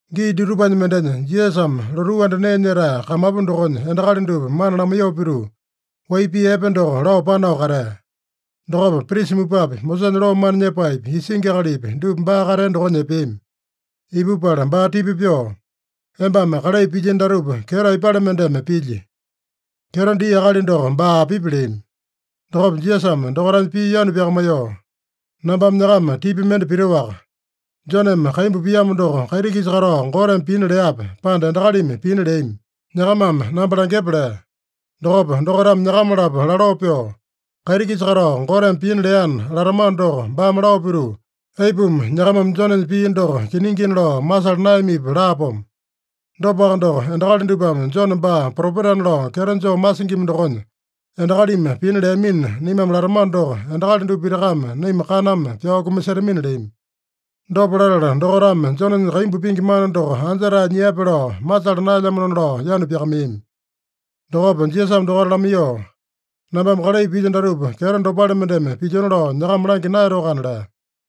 Gii dutupanya mendenya Jisasame lotuu anda nee nyetae kamapu dokonya endakali dupa mana lamaiyoo pituu, wai pii epe doko lao panao katea. Dokopa prisa mupapi, Mosesanya loo mana nyepaepi, isingi akalipi, dupa baa katea dokonya epeami. Ipupala baa tipa pyoo, “Embame kalai pilyino datupa, kyeto aipale mendeme pilyi? Kyeto dia akali doko baa apipi?” leami. Dokopa Jisasame dokaitanya pii yanu pyakamaiyoo, “Nambame nyakama tipa mende pitoaka: Joneme kaimbu piamo doko, kaiti-kisa katao Goteme pina leape, pande endakalimi pina leami? Nyakamame namba langyepa” lea. Dokopa dokaitame nyakama-lapo laloo pyoo, “ ‘Kaiti-kisa katao Goteme pina leana’ latamano doko, baame lao pituu, ‘Aipuma nyakamame Jonenya pii doko kiningina lao masala naeyamipi?’ laapomo. Dopaka doko, endakali dupame Jone baa propetana lao kyeto joo masingima dokonya, ‘Endakalimi pina leamina’ naimame latamano doko, endakali dupa pitakame naima kaname pyao kumasetamina” leami. Dopa latala dokaitame Jonenya kaimbu pingi mana doko anja-tae nyiape lao masala naelyamanona lao yanu pyakamaiyami. Dokopa Jisasame dokaita lamaiyoo, “Nambame kalai pilyo datupa kyeto dopale mendeme pilyona lao nyakama langya naeyatoakana” lea.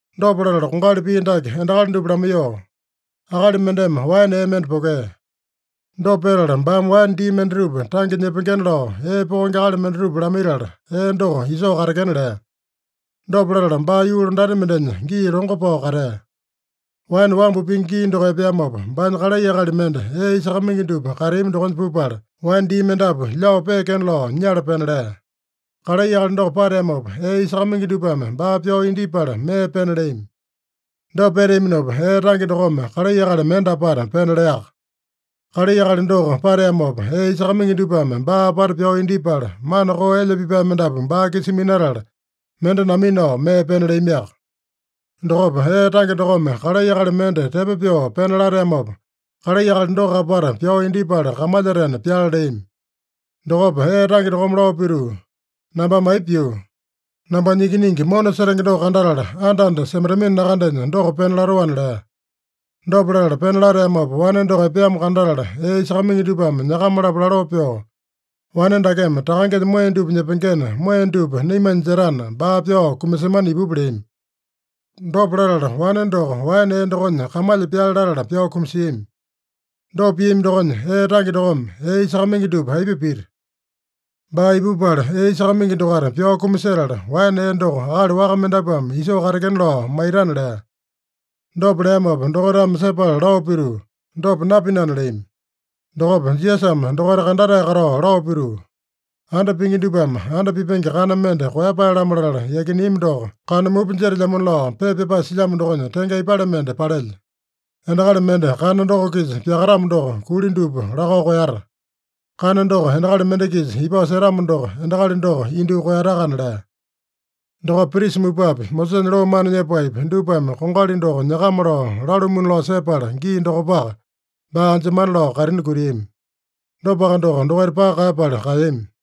Dopa latala kongali pii dake endakali dupa lamaiyoo, “Akali mendeme waene ee mende pokea. Dopa petala baame waene dii mendatupa tange nyepengena lao, ee pokenge akali mendatupa lamaitala, ee doko isoo katekena lea. Dopa latala baa yuu londati mendenya gii longo pao katea. Waene wambu pingi gii doko epeamopa, baanya kalai akali mende ee isakamaingi dupa kateami dokonya pupala, waene dii mendapu lyao peekena lao nyala pena lea. Kalai akali doko pateamopa, ee isakamaingi dupame baa pyao indyepala, mee pena leami. Dopa peteaminopa, ee tange dokome kalai akali mende apata pena leaka. Kalai akali doko pateamopa, ee isakamaingi dupame baa apata pyao indyepala, mana koo elya pipae mendapu baa-kisa minatala, mende naminao mee pena leamiaka. Dokopa ee tange dokome kalai akali mende tepo pyoo pena lateamopa, kalai akali doko apata pyao indyepala, kamalyatena pyale leami. Dokopa ee tange dokome lao pituu, ‘Nambame aipa pyuu? Nambanya ikiningi mona setenge doko kandatala, anda-anda semaitamino nakandenya, doko pena latoana’ lea. Dopa latala pena lateamopa wane doko epeamo kandatala, ee isakamaingi dupame nyakama-lapo laloo pyoo, ‘Wane dakeme takangenya moeya dupa nyepengena, moeya dupa naimanya jetana, baa pyao kumasemana ipupa’ leami. Dopa latala, wane doko waene ee dokonya kamalya pyale latala pyao kumasiami. Dopa piami dokonya, ee tange dokome ee isakamaingi dupa aipa pita? Baa ipupala, ee isakamaingi dokaita pyao kumasetala, waene ee doko akali waka mendapuame isoo katekena lao maitana” lea. Dopa leamopa dokaitame sepala lao pituu, “Dopa napinana” leami. Dokopa Jisasame dokaita kandatae katao lao pituu, “ ‘Anda pingi dupame anda pipenge kana mende koeyapae-lamo latala yakineami doko kana mupa jetelyamona’ lao pepa pyapae silyamo dokonya tenge aipale mende palelya? Endakali mende kana doko-kisa pyakatamo doko, kuli dupa lakao koeyata. Kana doko endakali mende-kisa ipao setamo doko, endakali doko indyoo koeyatakana” lea. Dokopa prisa mupapi, Mosesanya loo mana nyepaepi, dupame kongali doko nyakama lao lalumuna lao sepala gii dokopaka, baa anjemana lao kaitini kutiami. Dopaka doko, dokaita paka kaeyapala kaeyami.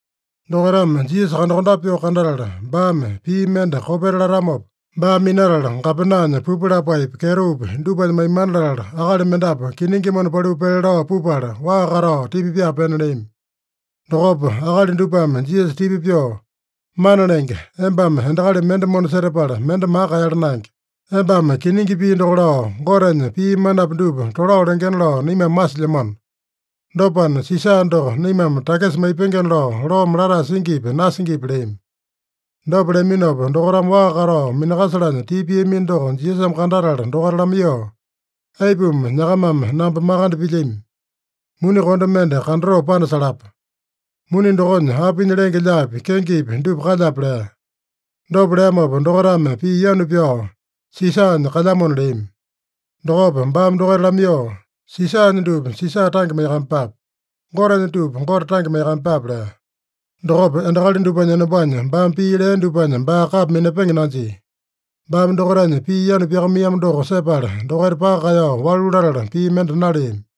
Dokaitame Jisasa kandakondape pyoo kandatala, baame pii mende kopeta latamopa, baa minatala gapenanya pupu lapaepi, kyetopi dupanya maimana latala, akali mendapu kiningi mona paliu pele lao pupala, waa katao tipa pyaa pena leami. Dokopa akali dupame Jisasa tipa pyoo, “Mana Lenge, embame endakali mende mona setapala, mende maka kaeyala naenge. Embame kiningi pii doko lao, Gotenya pii manapi dupa tolao lengena lao naimame masilyamano. Dopana, Sisa doko naimame takisa maipengena lao loome latae singipi, nasingipi?” leami. Dopa leaminopa, dokaitame waa katao minakasalanya tipa piamino doko Jisasame kandatala dokaita lamaiyoo, “Aipuma nyakamame namba makande pilyami? Muni konde mende kandatoo panasalapa. Muni dokonya apinya lenge-lyaapi, kengepi dupa kalyape?” lea. Dopa leamopa dokaitame pii yanu pyao, “Sisanya kalyamona” leami. Dokopa baame dokaita lamaiyoo, “Sisanya dupa Sisa tange maiyakamaiyepape. Gotenya dupa Gote tange maiyakamaiyepape” lea. Dokopa endakali dupanya enombanya baame pii lea dupanya baa kapa minapenge nanjia. Baame dokaitanya pii yanu pyakamaiyamo doko sepala, dokaita paka kaeyao walu latala, pii mende naleami.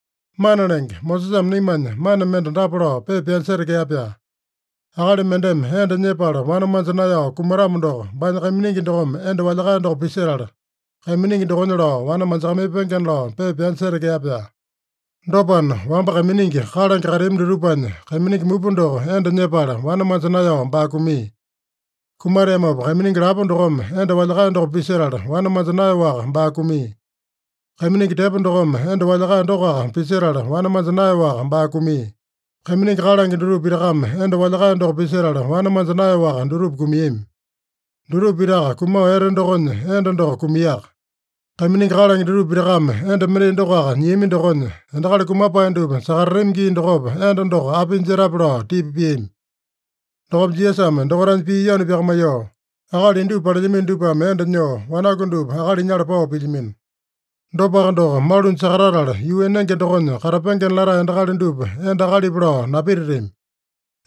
“Mana Lenge, Mosesame naimanya mana mende dapa lao pepa pyanya setekea-pyaa: ‘Akali mendeme enda nyepala wane manja naeyao kumatamo doko, baanya kaiminingi dokome enda walyakae doko pisetala, kaiminingi dokonya lao wane manjakamaipengena’ lao pepa pyanya setekea-pyaa. Dopana, wamba kaiminingi kalange kateami dutupanya kaiminingi mupa doko enda nyepala, wane manja naeyao baa kumia. Kumateamopa kaiminingi lapo dokome enda walyakae doko pisetala, wane manja naeyaowaka baa kumia. Kaiminingi tepo dokome enda walyakae dokoaka pisetala wane manja naeyaowaka baa kumia. Kaiminingi kalange dutupa pitakame enda walyakae doko pisetala, wane manja naeyaowaka dutupa kumiami. Dutupa pitaka kumao ete dokonya enda doko kumiaka. Kaiminingi kalange dutupa pitakame enda mendai dokoaka nyiami dokonya, endakali kumapae dupa sakatatami gii dokopa enda doko apinya jetape?” lao tipa piami. Dokopa Jisasame dokaitanya pii yanu pyakamaiyoo, “Akali indupa palelyamino dupame enda nyoo, wanaku dupa akali nyala pao pilyamino. Dopaka doko, malunya sakatatala yuu enenge dokonya katapengena latae endakali dupa enda akalipa lao napititami.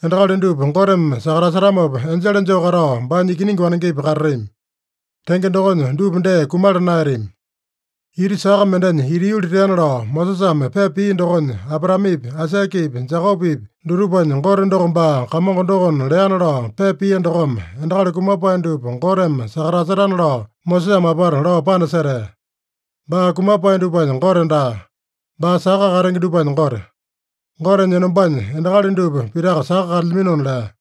Endakali dupa Goteme sakatasetamopa, enjele joo katao, baanya ikiningi wanengepi katatami. Tenge dokonya dupa dee kumala naeyatami. Ita saka mendenya ita yuli teana lao Mosesame pepa pia dokonya, Abraamepi, Aisakepi, Jekopepi dutupanya Gote doko baa Kamongo dokona leana lao pepa pia dokome, endakali kumapae dupa Goteme sakatasetana lao Mosesame apata lao panasetea. Baa kumapae dupanya Gote daa. Baa saka katenge dupanya Gote. Gotenya enombanya endakali dupa pitaka saka kalyaminona” lea.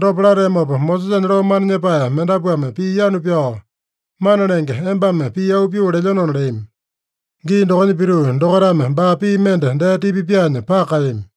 Dopa lateamopa, Mosesanya loo mana nyepae mendapuame pii yanu pyao, “Mana Lenge, embame pii auu pyoo lelyenona” leami. Gii dokonya pituu, dokaitame baa pii mende dee tipa pyaanya paka kaeyami.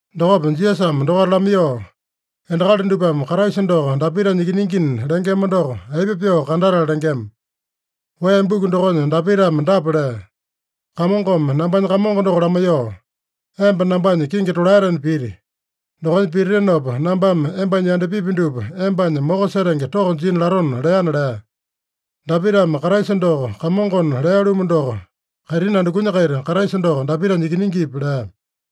Dokopa Jisasame dokaita lamaiyoo, “Endakali dupame Kraisa doko Dapitanya ikiningina lengema doko, aipa pyoo kandatala lengema? Wee buku dokonya Dapitame dapa lea: ‘Kamongome nambanya Kamongo doko lamaiyoo, “Emba nambanya kingi tolaetena piti. Dokonya pititinopa, nambame embanya yandapipi dupa embanya moko setenge toko jina latona” leana’ lea. Dapitame Kraisa doko Kamongona lea-lumu doko, kaitini andukunya-kaita Kraisa doko Dapitanya ikiningipi?” lea.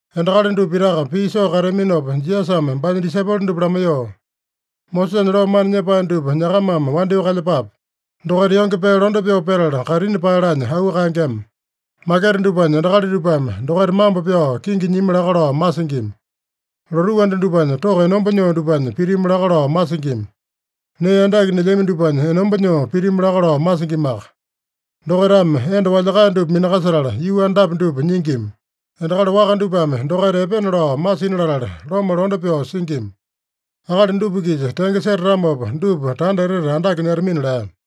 Endakali dupa pitaka pii soo kateaminopa, Jisasame baanya disaipolo dupa lamaiyoo, “Mosesanya loo mana nyepae dupa nyakamame wandyoo kalyepape. Dokaita yonge pee londe pyoo petala kaitini paeyalanya auu kaengema. Maketa dupanya endakali dupame dokaita mambo pyao kingi nyimi laka lao masingima. Lotuu anda dupanya toko enomba nyoo dupanya pitimu laka lao masingima. Nee andake nelyami dupanya enomba nyoo pitimu laka lao masingimaka. Dokaitame enda walyakae dupa minakasetala, yuu andapi dupa nyingima. Endakali waka dupame dokaita epena lao masina latala, loma londe pyoo singima. Akali dupa-kisa tenge setatamopa, dupa tanda etete andake nyetamina” lea.